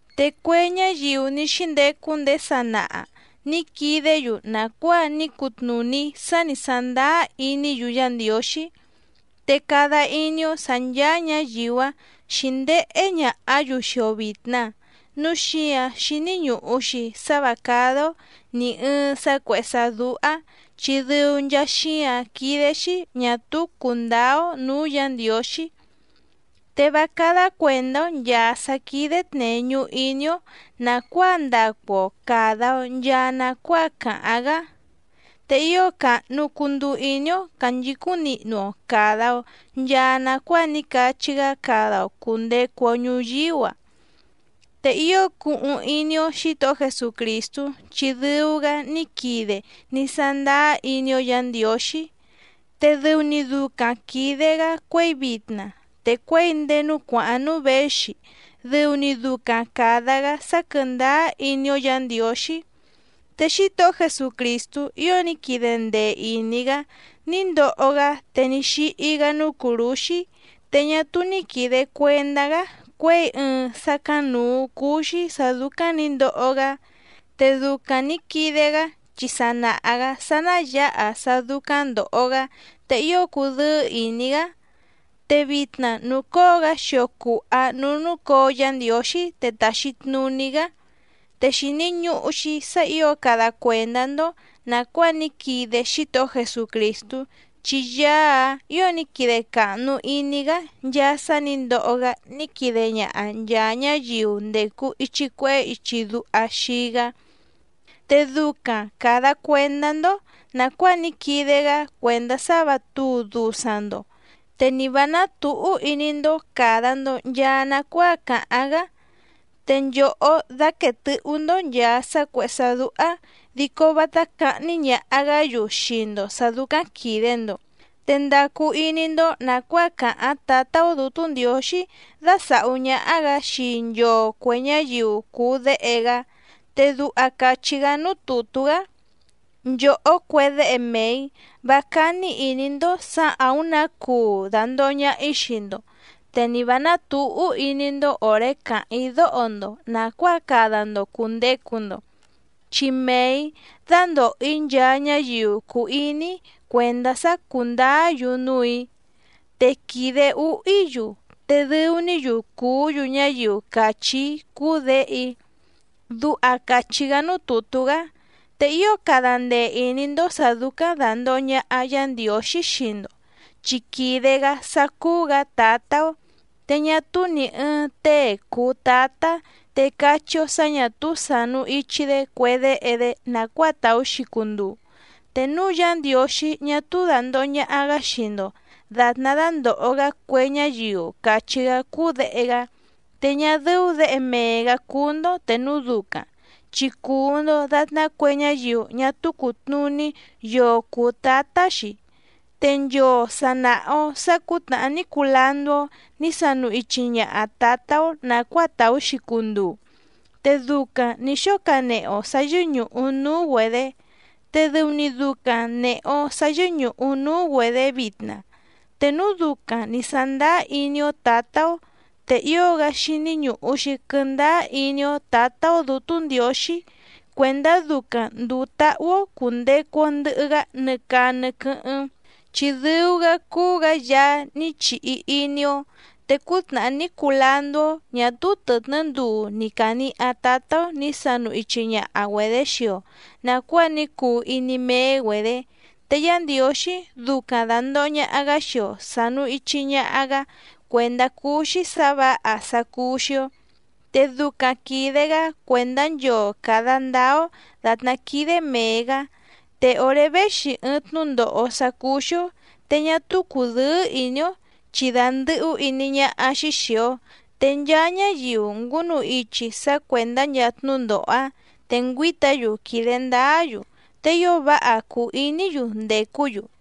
Te cue ñáyiu ní xíndecu ndéé sanaha nǐ quidé‑yu nàcuáa ní cutnùní sá nǐ sándáá iní‑yu Yá Ndiǒxí. Te cada iní‑ó sǎ ncháá ñǎyiu‑áⁿ xǐndéhé ñàhá‑yu xii‑o vìtna. Núu xíǎⁿ xíní ñùhu‑xi sá vǎ cádá‑ó nì ɨɨⁿ sá cuèhé sá dúhá chi dɨu nchaa xíǎⁿ quídé‑xí ñà túú cùndáá‑ó nǔú Yǎ Ndiǒxí. Te vá cádá cuèndá‑ó nchàa sá quídé tnèñu iní‑ó nàcuáa ndacu‑o càda‑o nchaa nacuáa càháⁿ‑gá. Te ío càhnu cunduu iní‑ó cànchicúⁿ nihnu‑o càda‑o nchaa nacuáa ní cachí‑gá cada‑o cùndecu‑o ñuyíú‑a. Te ío cuhuⁿ iní‑ó Xǐtohó Jesucrìstú, chi dɨu‑gá ní quide ní sándáá iní‑ó Yǎ Ndiǒxí, te dɨu‑ni ducaⁿ quìde‑gá cuěi vitna te cuěi ndéé núú cuàháⁿ núú věxi dɨu‑ni ducaⁿ càda‑gá sá quɨ̀ndáá iní‑ó Yǎ Ndiǒxí. Te Xítohó Jesucrìstú ío ní quide ndee ìní‑gá ní ndoho‑gá te ní xíhí‑gá núú cùrúxí, te ñá túú ní quìde cuendá‑gá cuěi ɨɨⁿ sácáⁿnǔú cúú‑xí sǎ dúcáⁿ nǐ ndoho‑gá. Te ducaⁿ nǐ quide‑gá chi sa nàha‑gá sá ná yǎha sá dúcáⁿ ndòho‑gá te ío cudɨ́ɨ́ ìní‑gá. Te vitna nùcóo‑gá xio cùha núú núcǒo Yá Ndiǒxí te tàxi tnuní‑gá. Te xìni ñuhu‑xi sá ǐo cada cuèndá‑ndó nàcuáa ní quide Xítohó Jesucrìstú chi Yaá‑áⁿ ǐo ní quide càhnu iní‑gá nchaa sá nǐ ndoho‑gá ní quide ñaha nchàa ñáyiu ndècu ichi cuehé ichi duha xii‑gá. Te ducaⁿ càda cuendá‑ndó nàcuáa ní quide‑gá cuèndá sá vǎ tǔu dusaⁿ‑ndo, te ni vǎ nátǔhú iní‑ndó càda‑ndo nchaa nacuáa càháⁿ‑gá. Te nchòhó dáquèe tɨhú‑ndó nchàa sá cuèhé sá dúhá dico vátá cáhní ñàha‑gá‑yu xii‑ndo sǎ dúcáⁿ quìde‑ndo. Te ndacu iní‑ndó nàcuáa càháⁿ Tǎtá‑ó Dǔtú Ndiǒxí dásàhú ñáhá‑gǎ xii nchoo cuè ñáyiu cùu déhe‑gá. Te duha càchí‑gá núú tùtú‑gá: Nchòhó cue déhe mee‑ǐ, vá cání ìní‑ndó sǎ àúⁿ nǎ cuu dàndoho ñaha‑í xii‑ndo, te ni vǎ nátǔhú iní‑ndó òré càháⁿ‑í dóho‑ndo nàcuáa cada‑ndo cùndecu‑ndo. Chi mee‑ǐ dándòho‑í nchaa ñáyiu cùu iní‑í cuèndá sá cúndǎá‑yu núù‑í, te quìde úhú‑í‑yu, te dɨu‑ní‑yu cùú‑yu ñáyiu càchí‑í cúú děhe‑í. Duha càchí‑gá núú tùtú‑gá. Te ío cada ndee ìní‑ndó sǎ dúcáⁿ dàndoho ñaha Yá Ndiǒxí xii‑ndo, chi quìde‑gá sá cúú‑gǎ Tǎtá‑ó. Te ñá túú nì ɨɨⁿ tée cùu tátá te cachí‑ó sǎ ñà túú sànu ichi‑dé cue déhe‑dé nàcuáa tàú‑xi cunduu. Te núu Yá Ndiǒxí ñá túú dàndoho ñaha‑gá xii‑ndo dàtná dándòho‑gá cue ñáyiu càchí‑gá cúú děhe‑gá, te ñá dɨ́ú děhe mee‑gǎ cúú‑ndó te núu ducaⁿ, chi cùu‑ndo datná cue ñáyiu ñá túú cùtnuní yoo cùu tátá‑xi. Te nchoo sà naha‑o sá cǔtnàhá ní cuu landú‑ó nǐ sanu ichi ñaha tǎtá‑ó nàcuáa tàú‑xi cunduu, te ducaⁿ nǐ xóo canehe‑o sǎ yɨ́ñùhu núú‑güedě te dɨu‑ni ducaⁿ nèhe‑o sá yɨ́ñùhu núú‑güedě vitna. Te núu ducaⁿ nǐ sándáá iní‑ó tǎtá‑ó, te ío‑gá xíní ñùhu‑xi quɨ́ndáá iní‑ó Tǎtá‑ó Dǔtú Ndiǒxí cuèndá ducaⁿ ndùu táhú‑ó cùndecu‑o ndɨhɨ‑gá nɨ caa nɨ quɨ́hɨ́ⁿ, chi dɨu‑gá cúú‑gǎ Yaá ní chihi iní‑ó. Te cútnàhá ní cuu landú‑ó, ñá túú tɨ̀tnɨ́ nduu ni càniha tátá‑ó nǐ sanu ichi ñaha‑güedě xii‑o nàcuáa ní cuu iní méé‑güedě. Te Yá Ndiǒxí ducaⁿ dàndoho ñaha‑gá xii‑o sànu ichi ñaha‑gá cuèndá cúú‑xí sǎ vǎha sá cúú‑xí‑ó, te ducaⁿ quìde‑gá cuèndá nchoo càda ndáá‑ó dàtná quídé mèe‑gá. Te òré véxi ɨɨⁿ tnúndòho sá cúú‑xí‑ó te ñá túú cùdɨ́ɨ́ ìní‑ó chi dàndɨhú iní ñáhá‑xí xìi‑o. Te nchaa ñáyiu ngúnu ichi sá cuèndá nchaa tnúndòho‑áⁿ te ngüǐta‑yu quìde ndáá‑yu, te ío váha cùu iní‑yu ndècú‑yu.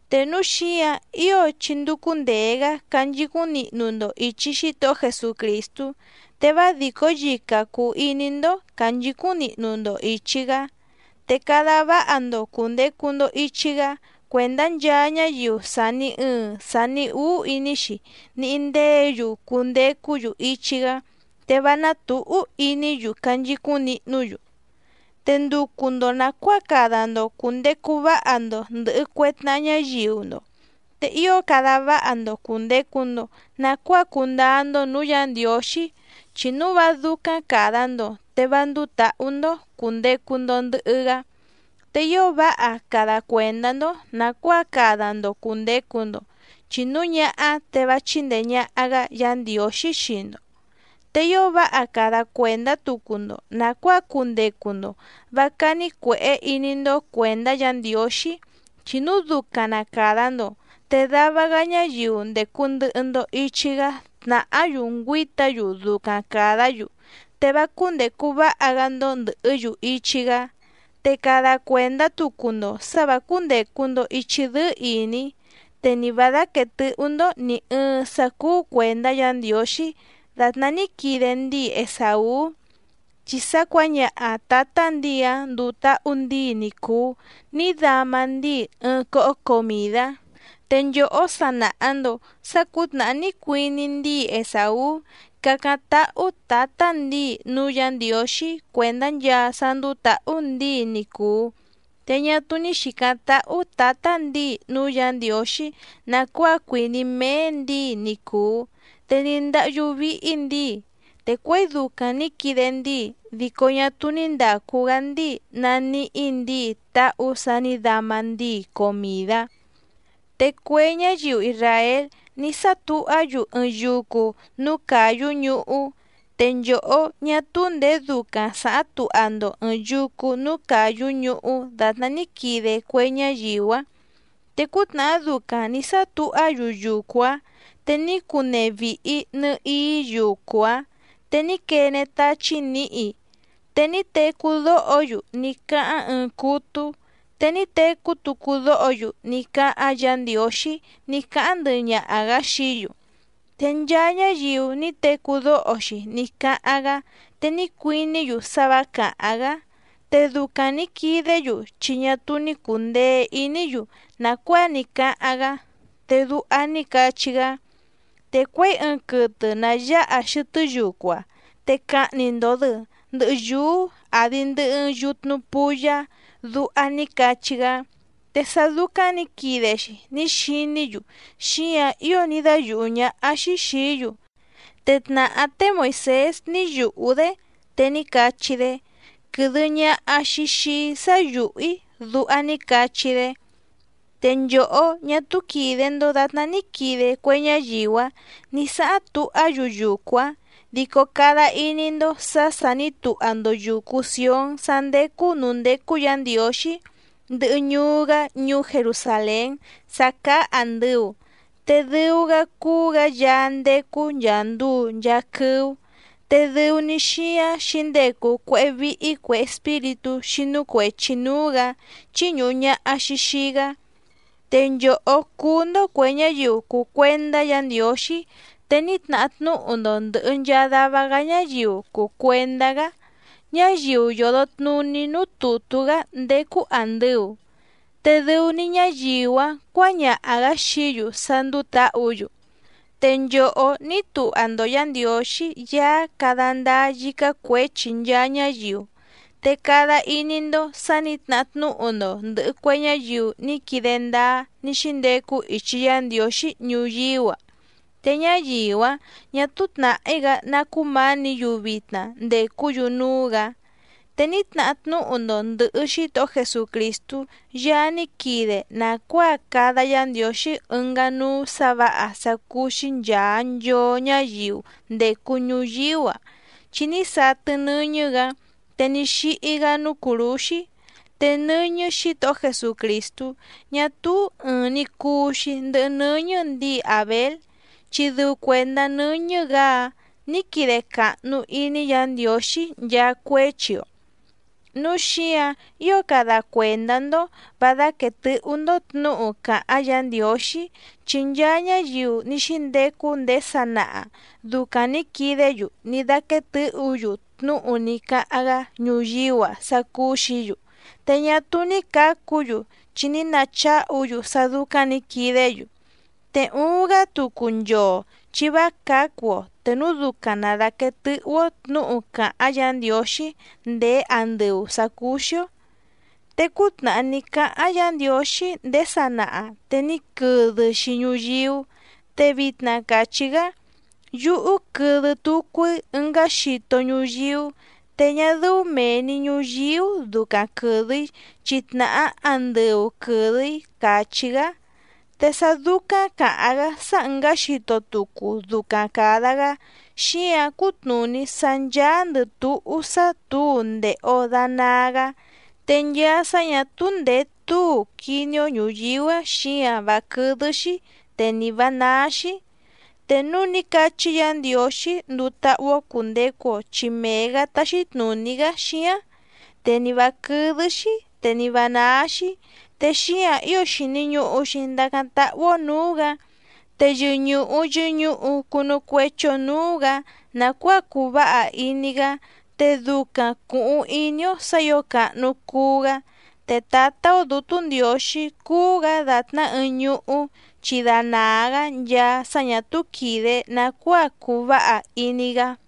Te núu xíǎⁿ ío chí ndúcú ndèe‑gá canchicúⁿ nihnu‑ndo ìchi Xítohó Jesucrìstú, te vá dìcó yica cùu iní‑ndó cànchicúⁿ nihnu‑ndo ìchi‑gá. Te cada váha‑ndo cùndecu‑ndo ichi‑gá cuèndá nchaa ñáyiu sàni ɨɨⁿ sani úú iní‑xi níhí ndéě‑yu cundecú‑yu ichi‑gá te vá ná tǔhú iní‑yu canchicúⁿ nihnú‑yu. Te nducu‑ndo nàcuáa cada‑ndo cùndecu váha‑ndo ndɨ̀hɨ cue tnaha ñáyiu‑ndo, te ío cada váha‑ndo cùndecu‑ndo nacuáa cundáá‑ndó nǔú Yǎ Ndiǒxí chi núu vá dúcáⁿ càda‑ndo te vá ndúú tǎhú‑ndó cùndecu‑ndo ndɨhɨ‑gá. Te ío váha cada cuèndá‑ndó nàcuáa cada‑ndo cùndecu‑ndo, chi núu ñáhá te vá chíndèe ñaha‑gá Yǎ Ndiǒxí xii‑ndo. Te ío váha cada cuèndá tucu‑ndo nàcuáa cundecu‑ndo vǎ cání cuèhé iní‑ndó cuèndá Yǎ Ndiǒxí, chi núu ducaⁿ na càda‑ndo te dava‑gá ñáyiu ndècu ndɨhɨ‑ndo ichi‑gá tnàhá‑yu ngüíta‑yu ducaⁿ càdá‑yu, te vá cúndècu váha‑gá‑ndó ndɨ̀hɨ́‑yu ichi‑gá. Te cada cuèndá tucu‑ndo sǎ vǎ cúndècu‑ndo ichi dɨ́ɨ́ ìní, te ni vǎ dáquèe tɨhú‑ndó nì ɨɨⁿ sá cúú cuèndá Yǎ Ndiǒxí dàtná ní quide ndíi Esàú, chi sá cuǎñaha tǎtá ndǐi‑áⁿ nduu táhú ndǐi ni cùu ní dama ndíi ɨɨⁿ cóhó comìdá. Te nchòhó sa nàha‑ndo sá cǔtnàhá ní cuiní ndíi Esàú cácáⁿ táhú tǎtá ndǐi núú Yǎ Ndiǒxí cuèndá nchaa sá ndúú tǎhú ndǐi ni cùu, te ñá túú ní xìcáⁿ tàhú tǎtá ndǐi núú Yǎ Ndiǒxí nàcuáa cuìní méé ndǐi ni cùu. Te ní ndáhyú víhí ndǐi, te cuěi ducaⁿ nǐ quide ndíi dico ñá túú ní ndàcu‑gá ndíi nàníhí ndǐi táhú sǎ nǐ dama ndíi comìdá. Te cue ñáyiu isràél ní sátuhá‑yu ɨɨⁿ yucu núú càyú ñuhú, te nchòhó ñá túú ndèé ducaⁿ sàháⁿ tuha‑ndo ɨ̀ɨⁿ yucu núú càyú ñuhú dàtná ní quide cue ñáyiu‑áⁿ. Te cútnàhá ducaⁿ nǐ sátuhá‑yu yucu‑áⁿ te ní cunee vìhi nɨhií yucu‑áⁿ, te ní quene táchí nǐhi. Te ní tecú dóho‑yu ní cáháⁿ ɨɨⁿ cútú, te ní tecú tucu dóho‑yu ní cáháⁿ Yǎ Ndiǒxí ní cáháⁿ ndɨhɨ ñaha‑gǎ xií‑yu. Te nchaa ñáyiu ní tecú dóho‑xi ní cáháⁿ‑gá te ní cuiní‑yu sá vǎ càháⁿ‑gá. Te ducaⁿ nǐ quidé‑yu chi ñá túú ní cùndee iní‑yu nàcuáa ní cáháⁿ‑gá, te duha ní cachí‑gá: “Te cuěi ɨɨⁿ quɨtɨ nà yáha xɨtɨ́ yucu‑a, te cahni‑ndo‑dɨ ndɨ̀hɨ yúú àdi ndɨhɨ ɨɨⁿ yutnu puyá”, duha ní cachí‑gá. Te sá dúcáⁿ nǐ quide‑xi ní xiní‑yu xíǎⁿ ío ní dáyùhú ñáhá‑xí xìí‑yu. Te tnàhá té Moìsés ní yùhú‑dé, te ní cachí‑dé: “Quɨ̀dɨ ñaha‑xi xii‑í sá yùhú‑í”, duha ní cachí‑dé. Te nchòhó, ñá túú quìde‑ndo datná ní quide cue ñáyiu‑áⁿ nǐ sáháⁿ tuhá‑yu yucu‑áⁿ, dico cada iní‑ndó sǎ sà ní tuha‑ndo yùcu Sión sá ndécú nǔú ndécú Yǎ Ndiǒxí, ndɨhɨ ñuú‑gá ñuú Jerusàlén sá cáá àndɨu te dɨu‑gá cúú‑gǎ Yaá ndécú nchàa nduu nchaa quɨ́ú. Te dɨu‑ni xíáⁿ xǐndecu cuéhé víhí cuè espíritú xínú cuèchi núú‑gǎ chíñùhu ñaha‑xi xii‑gá. Te nchòhó cúú‑ndó cuè ñáyiu cùu cuendá Yǎ Ndiǒxí, te ní tnahá tnúhu‑ndo ndɨ̀hɨ nchaa dava‑gá ñáyiu cùu cuendá‑gá, ñáyiu yòdo tnuní núú tùtú‑gá ndécú àndɨu, te dɨu‑ni ñáyiu‑áⁿ cuǎñaha‑gǎ xií‑yu sá ndúú tǎhǔ‑yu. Te nchòhó ní tuha‑ndo Yǎ Ndiǒxí Yaá cada ndáá yícá cuěchi nchaa ñáyiu. Te cada iní‑ndó sǎ nǐ tnahá tnúhu‑ndo ndɨ̀hɨ cue ñáyiu ní quide ndáá ní xíndecu ichi Yá Ndiǒxí ñuyíú‑a. Te ñáyiu‑áⁿ ñà túú tnàhí‑gá ná cúmǎnǐ‑yu vitna ndècú‑yu núú‑gǎ. Te ní tnahá tnúhu‑ndo ndɨ̀hɨ Xítohó Jesucrìstú Yaá ní quide nàcuáa cada Yá Ndiǒxí ɨngá núú sǎ vǎha sá cúú‑xí nchàa nchoo ñáyiu ndècu ñuyíú‑a, chi ní satɨ nɨ́ñɨ́‑gǎ te ní xíhí‑gá núú cùrúxí. Te nɨ́ñɨ́ Xǐtohó Jesucrìstú ñá túú ɨ̀ɨⁿ‑ni cuu‑xi ndɨhɨ nɨ́ñɨ́ ndǐi Àbél, chi dɨu cuèndá nɨ́ñɨ́‑gǎ‑áⁿ nǐ quide càhnu iní Yǎ Ndiǒxí nchaa cuéchi‑o. Núu xíǎⁿ ío cada cuèndá‑ndó vǎ dáquèe tɨhú‑ndó tnǔhu càháⁿ Yǎ Ndiǒxí, chi nchaa ñáyiu ní xíndecu ndéé sanaha dùcaⁿ ní quidé‑yu ní dáquéé tɨ̌hǔ‑yu tnúhu ní cáháⁿ‑gá ñuyíú‑a sá cúú‑xǐ‑yu. Te ñá túú ní cǎcu‑yu chi ní nacháhu‑yu sá dúcáⁿ nǐ quidé‑yu. Te uuⁿ‑gá tucu nchoo chi vá cǎcu‑o te núu ducaⁿ na dàquee tɨhú‑ó tnǔhu càháⁿ Yǎ Ndiǒxí ndéé andɨu sǎ cúú‑xí‑ó. Te cútnàhá ní cáháⁿ Yǎ Ndiǒxí ndéé sanaha te ní quɨdɨ‑xi ñuyíú. Te vitna càchí‑gá: “Yúhú quɨdɨ tucu‑í ɨngá xito ñuyíú, te ñá dɨ́ú mèe‑ni ñuyíú ducaⁿ quɨ̀dɨ‑í chi tnàhá andɨu quɨ̀dɨ‑í”, càchí‑gá. Te sá dúcáⁿ càháⁿ‑gá sá ɨ̀ngá xito tucu ducaⁿ càda‑gá xíǎⁿ cútnùní sá ncháándɨ̀ túhú sá tǔu ndèhe‑o danaa‑gá. Te nchaa sá ñà túú ndèé tǔu quiní‑ó ñùyíú‑a xíǎⁿ vá quɨ́dɨ́‑xí te ni vǎ náá‑xí. Te núú nǐ cachí Yǎ Ndiǒxí nduu táhú‑ó cùndecu‑o chi mee‑gǎ táxí tnùní‑gá xíáⁿ, te ni vǎ quɨ́dɨ́‑xí te ni vǎ náá‑xí. Te xíǎⁿ ío xìni ñuhu‑xi ndacáⁿ táhú‑ó nǔú‑gǎ, te yɨñùhu yɨñuhu cunu cuechi‑o núú‑gǎ nàcuáa cuu váha iní‑gá, te ducaⁿ cùhuⁿ iní‑ó sǎ ǐo càhnu cuu‑gá. Te Tǎtá‑ó Dǔtú Ndiǒxí cúú‑gǎ dàtná ɨɨⁿ ñuhú chi danàa‑gá nchaa sá ñà túú quìde nacuáa cuu váha iní‑gá.